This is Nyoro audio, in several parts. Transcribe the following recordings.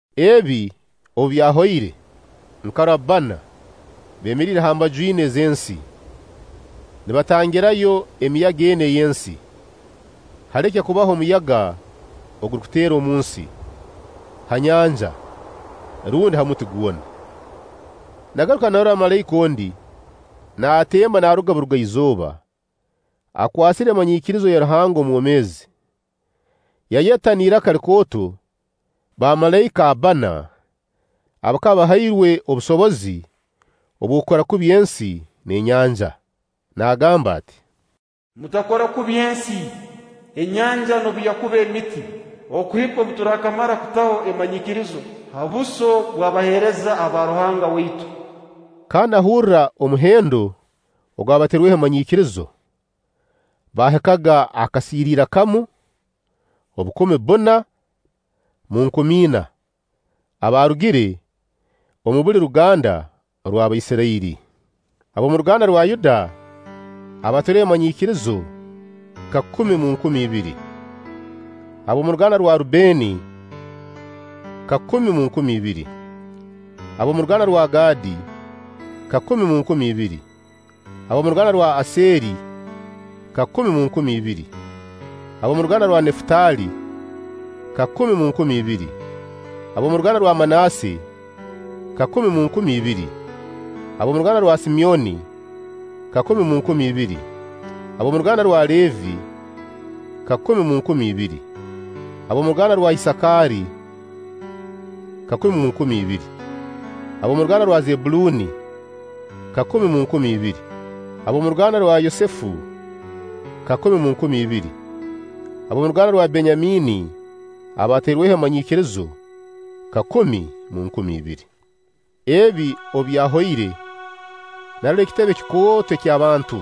Ebi obu byahoire, nkarora bbana beemeriire ha mbaju ina ez'ensi, nibatangirayo emiyaga ena ey'ensi, haleke kubaho omuyaga ogurukuteera omunsi, ha nyanja rundi ha muti gwona. Nagaruka narora malaika ondi naatemba naaruga Buruga-izooba, akwasire emanyiikirizo ya Ruhanga omwomeezi, yayeta n'iraka likooto bamalaika abbana abakaba bahairwe obusobozi obw'okukora kubi ensi n'enyanja, naagamba ati: “Mutakora kubi ensi, enyanja noobu yakuba emiti, okuhika obu turakamara okuta emanyiikirizo ha buso bw'abaheereza aba Ruhanga waitu.” Kandi nahurra omuhendo gw'abatairweho emanyiikirizo, baahikaga akasiiriira kamu, obukumi bbuna mu nkumi ina, abaarugire omu buli ruganda orw'Abaisirairi. Ab'omu ruganda rwa Yuda abatairweho emanyiikirizo kakumi mu nkumi ibiri; ab'omu ruganda rwa Rubbeeni, kakumi mu nkumi ibiri; ab'omu ruganda rwa Gadi, kakumi mu nkumi ibiri; ab'omu ruganda rw'Aseeri, kakumi mu nkumi ibiri; ab'omu ruganda rwa Nefutaali, kakumi mu nkumi ibiri; ab'omu ruganda rwa Manaasse, kakumi mu nkumi ibiri; ab'omu ruganda rwa Simyoni, kakumi mu nkumi ibiri; ab'omu ruganda rwa Leevi, kakumi mu nkumi ibiri; ab'omu ruganda rwa Isaakaari, kakumi mu nkumi ibiri; ab'omu ruganda rwa Zebbuluni, kakumi mu nkumi ibiri; ab'omu ruganda rwa Yosefu, kakumi mu nkumi ibiri; ab'omu ruganda rwa Benyamiini abatairweho emanyiikirizo, kakumi mu nkumi ibiri. Ebi obu byahoire, narora ekitebe kikooto eky'abantu,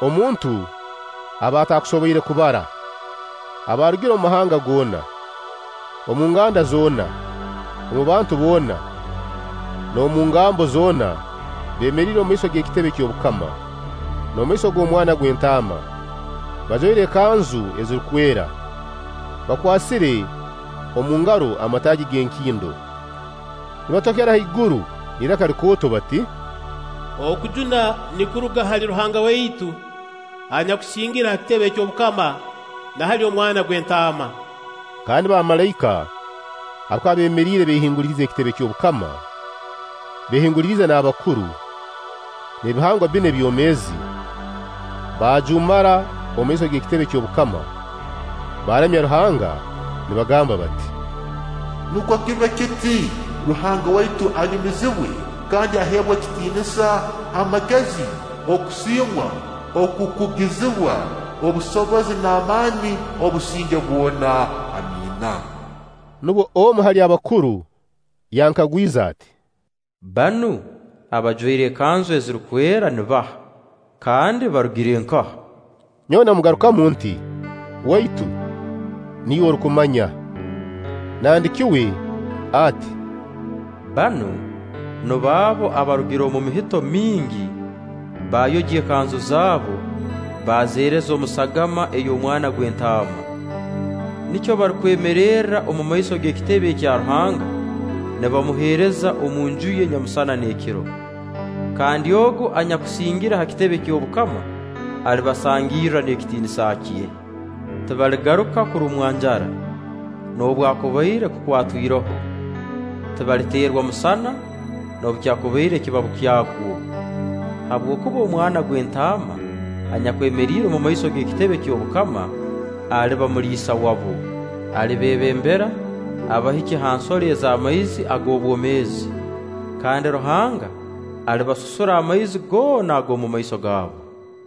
omuntu aba ataakusoboire kubara, abaarugire omu mahanga goona, omu nganda zoona, omu bantu boona n'omu ngambo zoona beemeriire omumaiso g'ekitebe ky'obukama, n'omumaiso g'Omwana gw'Entaama, bajwaire ekanzu ezirukwera, bakwasire omu ngaro amataagi g'enkindo, nibatokera haiguru n'iraka likooto bati: “Okujuna nikuruga hali Ruhanga waitu anyakusingire ha kitebe ky'obukama, na hali Omwana gw'Entaama!” Kandi bamalaika abakaba beemeriire beehinguliriize ekitebe ky'obukama, beehinguliriize n'abakuru, n'ebihangwa bbina ebyomeezi, baajuumara omu maiso g'ekitebe ky'obukama, baaramya Ruhanga, nibagamba bati: “Nukwo kibe kiti! Ruhanga waitu anyumiziibwe kandi aheebwe ekitiinisa, amagezi, okusiimwa, okukugizibwa, obusobozi n'amaani obusinge bwona! Amiina.” Nubwo omu hali abakuru yankagwize ati: “Banu abajwaire ekanzu ezirukwera nibaha, kandi barugire nkaha?” Nyowe namugarukamu nti: “Waitu, niiwe orukumanya.” Nandiki uwe ati: “Banu nubo abo abaarugire omu mihito mingi; baayogya ekanzu zabo, baazeereza omu sagama ey'Omwana gw'Entaama. Nikyo barukwemererra omumaiso g'ekitebe ekya Ruhanga, nibamuheereza omunju ye nyamusana n'ekiro; kandi Ogu anyakusingire ha kitebe ky'obukama, alibasangirra n'ekitiinisa kye. Tibaligaruka kurumwa njara, noobwakubaire kukwatwa iroho; tibaliteerwa musana, noobu kyakubaire ekibabu kyagwo. Habwokuba Omwana gw'Entaana anyakwemeriire omu maiso g'ekitebe ky'obukama, aliba muliisa wabo, alibeebembera abahikye ha nsoro ez'amaizi ag'obwomeezi; kandi Ruhanga alibasusura amaizi goona ag'omumaiso gabo.”